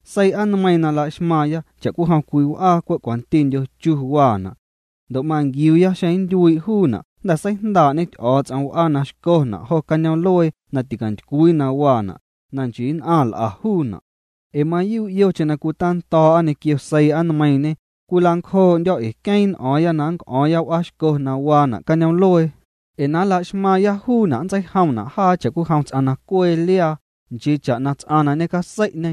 Seii'a nmeiiⁿ la'xmaⁿna' cha'cwijom cwii w'aa na cwe' cwantindyo chu waana'. Ndo' manquiuuya xeⁿ nntyuii' juuna' jnda̱ seijndaa'ñe Ty'o̱o̱ts'om w'aa na xcona' jo cañoom'luee na ticantycwii na waana', na nchii nn'aⁿ l'a juuna'. Ee mayuu' yocheⁿ na cwitando̱o̱'a ñequio seii'a nmeiiⁿñe, cwila'ncjoo'ndyo̱ ee queeⁿ n'o̱o̱ⁿya na nnc'o̱o̱ⁿya w'aaxco na waana' cañoom'luee, ee na nla'xmaaⁿya juuna', nntseijomna' jaa cha'cwijom ts'aⁿ na cwee liaa', nchii cha'na ts'aⁿ na ñecasei'ñe.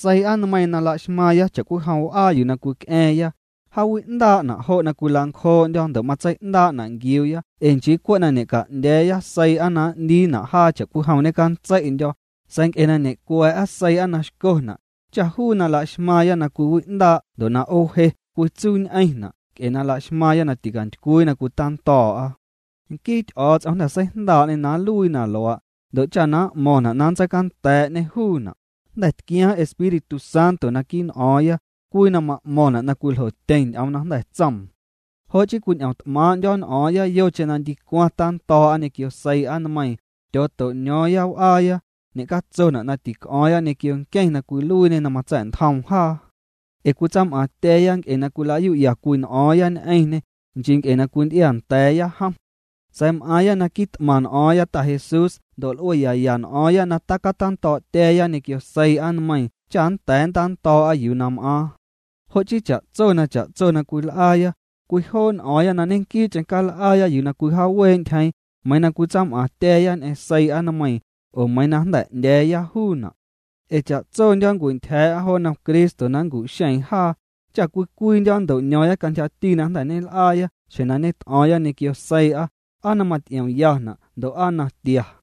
Seii'a nmeiiⁿ na laxmaⁿna' cha'cwijom w'aa yuu na cwic'a̱a̱ⁿya, jaawi'ndaa'na', jo' cwilancjoo'ndyo̱ ndo' matsei'ndaa'na' nquiuuya ee nchii cwe' na ñeca'ndya̱a̱ya seii'a na n'ndiina' jaa cha'cwijom ñecantsei'ndyo̱, sa̱a̱ nc'e na ñe'cwa̱a̱'a seii'a na xcona', cha juu na laxmaaⁿya na cwiwi'ndaa' ndo' na 'oowje cwitsuuñ'eⁿna' nc'e na laxmaaⁿya na ticantycwii na cwitando̱o̱'a. Nquii Ty'o̱o̱ts'om jnda̱ seijndaa'ñê na nluii na luaa', ndo' cha na m'mo̱ⁿna' na nntseicanda̱a̱'ñê juuna', jnda̱ tquiaaⁿ Espíritu Santo naquii' n'o̱o̱ⁿya, cwii na ma'mo̱ⁿna' na cwiljotyeⁿ ñ'oom na jnda̱ tsoom. Jo' chii cwiñ'omt'maaⁿ'ndyo̱ n'o̱o̱ⁿya na yocheⁿ na ndicwaⁿ tando̱o̱'a ñequio seii'a nmeiiⁿ, tyooto'ño̱o̱ⁿya w'aaya, ñecatsona' na tic'o̱o̱ⁿya ñequio nqueⁿ na cwiluiiñê na matsa̱'ntjoom jaa. Ee cwitsam'aaⁿtya̱a̱ya nc'e na cwila'yu'ya cwii n'o̱o̱ⁿya ñ'eⁿñê, nchii nc'e na cwinty'iaanda̱a̱ya jom. Sa̱a̱ m'aaⁿya na quit'maⁿ n'o̱o̱ⁿya Ta Jesús ndo' nl'ueyaya n'o̱o̱ⁿya na tacatando̱o̱'tya̱a̱ya ñequio seii'a nmeiiⁿ cha nnda̱a̱ nntando̱o̱'a yuu na m'aaⁿ. Jo' chii cha'tso na cha'tso na cwil'aaya, cwijoo' n'o̱o̱ⁿya na ñequii'cheⁿ cal'aaya yuu na cwijaawee'ntyjeeⁿ, meiiⁿ na cwitsam'aaⁿtya̱a̱ya ñ'eⁿ seii'a nmeiiⁿ, oo meiiⁿ na jnda̱ 'ndya̱a̱ya juuna'. Ee cha'tsondyo̱ nncwintyja̱a̱'a jo nnom Cristo na nncu'xeeⁿ jaa, cha cwii cwiindyo̱ nnto'ño̱o̱ⁿya cantyjati na jnda̱ ñel'aa xjeⁿ na ñet'o̱o̱ⁿya ñequio seii'a, aa na maty'iomyana' ndo' aa na tia.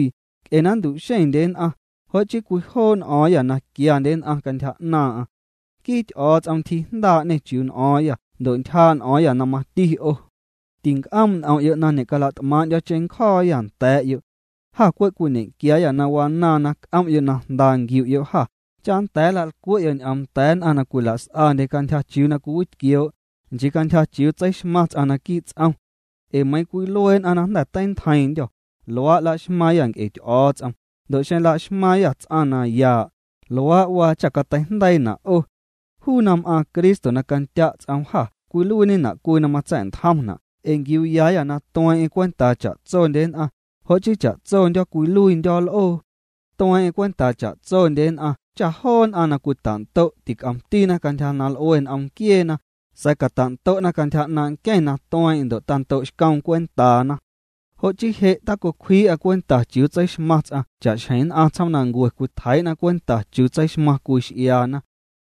Nc'e na nntu'xeⁿndye nn'aⁿ, jo' chii cwijoo' n'o̱o̱ⁿyâ na quiandye nn'aⁿ cantyja 'naaⁿ'aⁿ. Nquii Ty'o̱o̱ts'om ntyjiijndaa'ñê chiuu n'o̱o̱ⁿyâ ndo' ntyjaa' n'o̱o̱ⁿyâ na mati 'o. Tinc'oom' n'om'yo' na ñe'calat'maaⁿ'ndyo̱ cheⁿncjo̱o̱yâ nda̱a̱'yo'. Jâ cwe' cwiñequiaayâ na wanaaⁿ na c'om'yo' na jnda nquiu'yo' jâ, cha nnda̱a̱ nla'lcwe'yo' ñ'oom nda̱a̱ nn'aⁿ na cwilas'andye cantyja chiuu na cwiwitquioo', nchii cantyja chiuu tseixmaⁿ ts'aⁿ naquii' ts'om. Ee meiiⁿ cwilue nn'aⁿ na jnda̱ teintjeiⁿndyô̱, luaa' laxmaaⁿyâ nc'e Ty'o̱o̱ts'om, ndo' xeⁿ laxmaaⁿyâ ts'aⁿ na yaa', luaa' waa cha' cateijndeiina' 'o. Juu na m'aaⁿ Cristo na candya' ts'oom jâ cwiluiiñena' cwii na matsa̱'ntjomna' ee nquiuuyaayâ na tueeⁿ'eⁿ cwentaa cha'tsondye nn'aⁿ, jo' chii cha'tsondyo̱ cwiluiindyo̱ l'oo. Tueeⁿ'eⁿ cwentaa cha'tsondye nn'aⁿ cha joo nn'aⁿ na cwitando'na tic'omtina cantyja na l'ue n'om nquieena, sa̱a̱ catando'na cantyja 'naaⁿ' nqueⁿ na tueeⁿ'eⁿ ndo' tando'xcoom cwentaana. Jo' chii je' tacotjeii'â cwenta chiuu tseixmaⁿ ts'aⁿ cha'xjeⁿ nn'aⁿ tsjoomnancue cwitjeii'na cwenta chiuu tseixmaⁿ cwii x'iaana.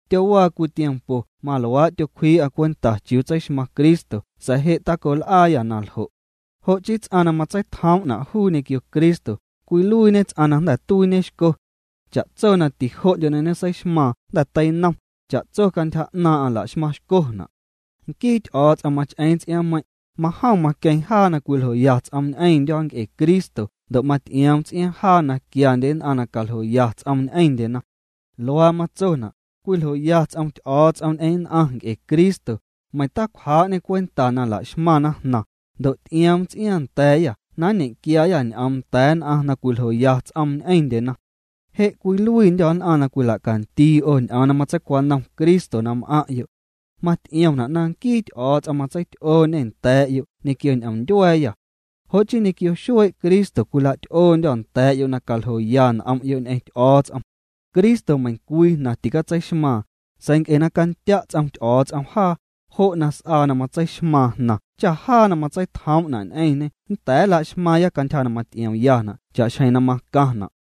Tyowaa cwii tiempo maluaa' tyotjeii'â cwenta chiuu tseixmaⁿ Cristo sa̱a̱ je' tacol'aayâ na ljo'. Jo' chii ts'aⁿ na matseitjoom'na' juu ñequio Cristo, cwiluiiñe ts'aⁿ na jnda̱ tuiiñe xco. Cha'tso na tijo'ndyo na ñeseixmaaⁿ jnda̱ teinom, cha'tso cantyja 'naaⁿ'aⁿ laxmaⁿ xcona'. Nquii Ty'o̱o̱ts'om mach'eeⁿ ts'iaaⁿmeiⁿ', majom maqueeⁿ jaa na cwiljoya ts'oom ñ'eⁿndyo̱ nc'e Cristo ndo' maty'ioom ts'iaaⁿ jaa na quiandye nn'aⁿ na caljoya ts'oom ñ'eⁿndyena. Luaa matsona': Cwiljoya ts'om Ty'o̱o̱ts'om ñ'eⁿ nn'aⁿ nc'e Cristo, meiⁿ ticwjaa'ñê cwenta na la'xmaⁿna jnaⁿ, ndo' ty'ioom ts'iaaⁿ nda̱a̱yâ na nñequiaayâ ñ'oom nda̱a̱ nn'aⁿ na cwiljoya ts'oom ñ'eⁿndyena. Je' cwiluiindyô̱ nn'aⁿ na cwila'candii 'o ñ'oom na matseicwanom Cristo na m'aⁿ'yo'. Maty'iomna' na nquii Ty'o̱o̱ts'om matseity'ooñê nda̱a̱'yo' ñequio ñ'omndyua̱a̱yâ. Jo' chii ñequio xuee' Cristo cwila'ty'oondyô̱ nda̱a̱'yo' na caljoya n'om'yo' ñ'eⁿ Ty'o̱o̱ts'om. Cristo meiⁿcwii jnaⁿ tîcatseixmaaⁿ, sa̱a̱ nc'e na candya' ts'om Ty'o̱o̱ts'om jaa, jo' na s'aa na matseixmaaⁿ jnaⁿ cha jaa na matseitjoom'na' ñ'eⁿñê nnda̱a̱ nla'xmaaⁿya cantyja na maty'iomyana' cha'xjeⁿ na macaⁿna'.